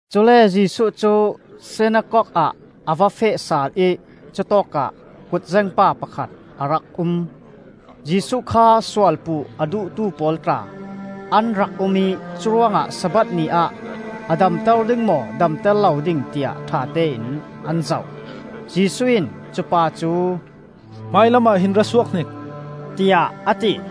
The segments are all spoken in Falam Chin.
Cule Jesuh cu sinakok ah a va feh sal ih cutawkah kut zengpa pakhat a rak um. Jesuh kha sualpuh a duhtu pawl tla an rak um ih curuangah Sabbath ni ah a damter ding maw damter lo ding tiah ṭhatein an zoh. Jesuh in cupa cu, “Hmailam ah hin ra suak hnik,” tiah a ti.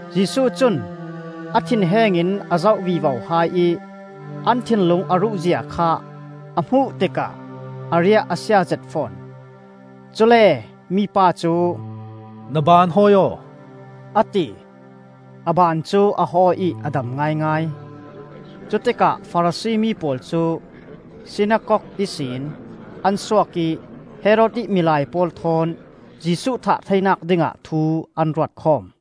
Jesuh cun a thinheng in a zoh vivo hai ih an thinlung a ruh zia kha a hmuh tikah a riah a sia zet fawn. Cule mi pa cu, “Na baan hawi aw,” a ti. A baan cu a hawi ih a dam ngaingai. Cutikah Farasi mi pawl cu sinakok ihsin an suak ih Herod ih milai pawl thawn Jesuh thah theinak dingah thu an ruatkhawm.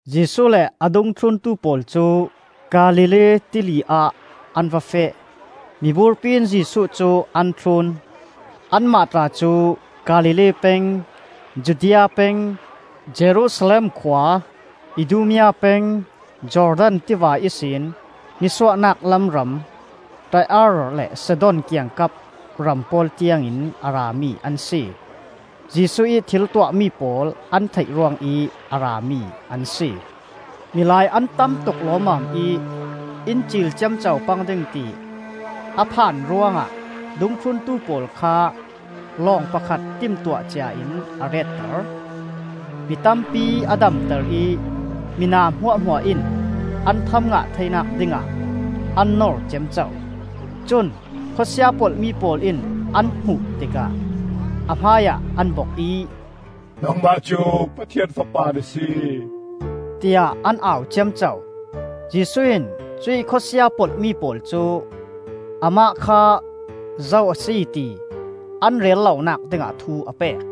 Jesuh le a dungthluntu pawl cu Galilee Tili ah an va feh; miburpi in Jesuh cu an thlun. Anmah tla cu Galilee peng, Judea peng, Jerusalem khua, Idumea peng, Jordan tiva ihsin nisuahnak lam ram, Tai-ar le Sidon kiangkap ram pawl tiang in a rami an si. Jesuh ih thil tuahmi pawl an theih ruangih a rami an si. Milai an tamtuk lawmmam ih in ciil ciamco pang ding ti a phan ruangah dungthluntu pawl kha lawng pakhat timtuah cia in a retter. Mi tampi a damter ih mina hmuahhmuah in an tham ngah theinak dingah an nor ciamco. Cun khawsia polhmi pawl in an hmuh tikah a hmaiah an bok ih, “Nangmah cu Pathian Fapa na si,” tiah an au ciamco. Jesuh in cuih khawsia polhmi pawl cu amah kha zo a si ti an rel lonak dingah thu a pek.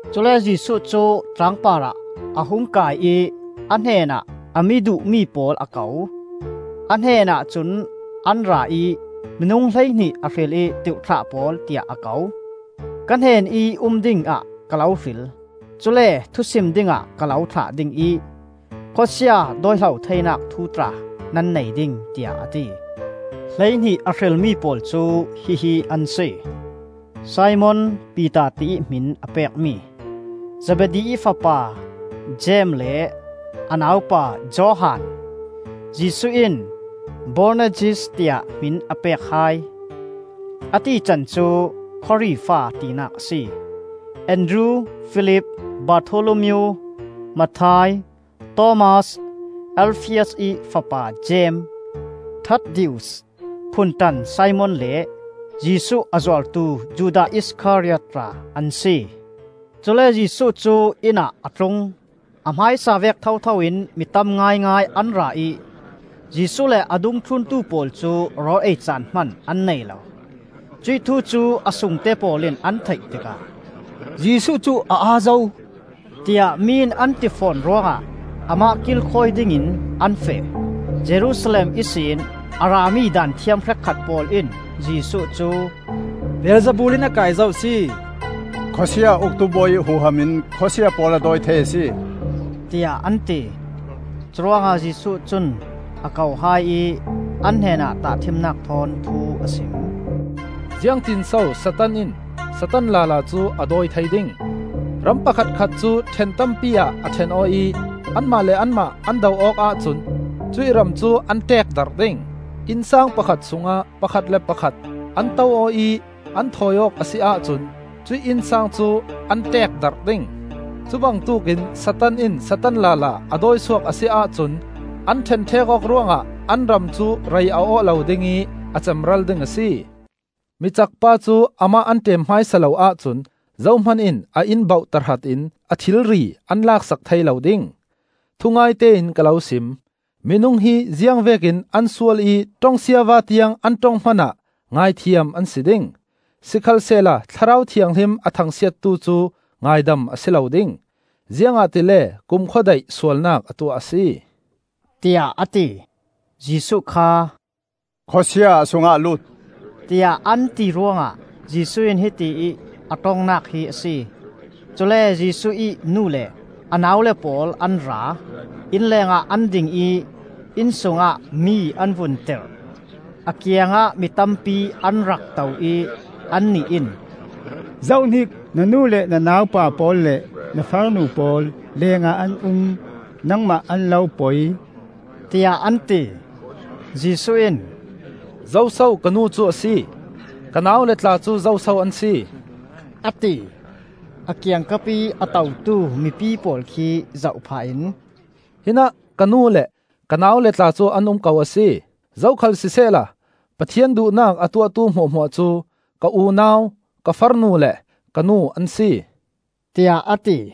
Cule Jesuh cu tlangpar ah a hung kai ih a hnenah a mi duhmi pawl a ko. A hnenah cun an ra ih, minung hleihnih a hril ih ‘Tirhthlah pawl,’ tiah a ko. “Ka hnenih um dingah ka lo hril. Cule thusim dingah ka lo thlah ding ih, khawsia dawihlo theinak thu tla nan nei ding,” tiah a ti. Hleihnih a hrilmi pawl cu hihi an si. Simon (Piter tiih hmin a pekmi), Zebedi ih fapa Jeim le a nau pa Johan (Jesuh in Boanerges tiah hmin a pek hai, a tican cu ‘Khawri Fa,’ tinak a si), Andru, Filip, Bartholomeo, Matthai, Thomas, Alfias ih fapa Jeim, Thaddaeus, Phunṭan Simon, le Jesuh a zuartu Judas Iskariot tla an si. Cule Jesuh cu inn ah a tlung. A hmaisa vek thotho in mi tam ngaingai an ra ih Jesuh le a dungthluntu pawl cu rawl ei caan hman an nei lo. Cuih thu cu a sungte pawl in an theih tikah, “Jesuh cu a aa zo,” tiah mi in an ti fawn ruangah amah kilkhawi dingin an feh. Jerusalem ihsin a rami Daanthiam hrekkhat pawl in Jesuh cu “Beelzebul in a kai zo a si. Khawsia uktu bawi ih huham in khawsia pawl a dawi thei a si,” tiah an ti. Curuangah Jesuh cun a ko hai ih an hnenah tahṭhimnak thawn thu a sim. “Ziangtin so Satan in Satan lala cu a dawi thei ding? Ram pakhatkhat cu ṭhen tampi ah a ṭhen aw ih anmah le anmah an do awk ahcun cuih ram cu an ṭekdarh ding. Innsang pakhat sungah pakhat le pakhat an to aw ih an thawi awk a si ahcun cuih innsang cu an ṭeekdarh ding. Cubangtuk in Satan in Satan lala a dawisuak a si ahcun an ṭhenṭhek awk ruangah an ram cu rei a awh lo ding ih a cemral ding a si. “Micak pa cu amah an ṭem hmaisa lo ahcun zohman in a inn bauh tahratin a thilri an lak sak thei lo ding. “Thungaite in ka lo sim: minung hi ziangvek in an sual ih ṭong siava tiang an ṭong hmanah ngaihthiam an si ding. Sikhalsehla Thlarau Thianghlim a thangsiattu cu ngaidam a si lo ding, ziangahtile kumkhua daih sualnak a tuah a si,” tiah a ti. Jesuh kha “Khawsia a sungah a lut,” tiah an ti ruangah Jesuh in hiti ih a ṭongnak hi a si. Cule Jesuh ih nu le a naule pawl an ra. Inn lengah an ding ih inn sungah mi an vun tirh. A kiangah mi tampi an rak to ih annih in, “Zohhnik, na nu le na naupa pawl le na farnu pawl leeng ah an um, nangmah an lo poi,” tiah an ti. Jesuh in, “Zoso ka nu cu a si? Ka naule tla cu zoso an si?” a ti. A kiangkapih a totu mipi pawl khi zoh phah in, “Hinah ka nu le ka naule tla cu an um ko a si. Zokhal sisehla Pathian duhnak a tuahtu hmuahhmuah cu ka unau, ka farnu le ka nu an si,” tiah a ti.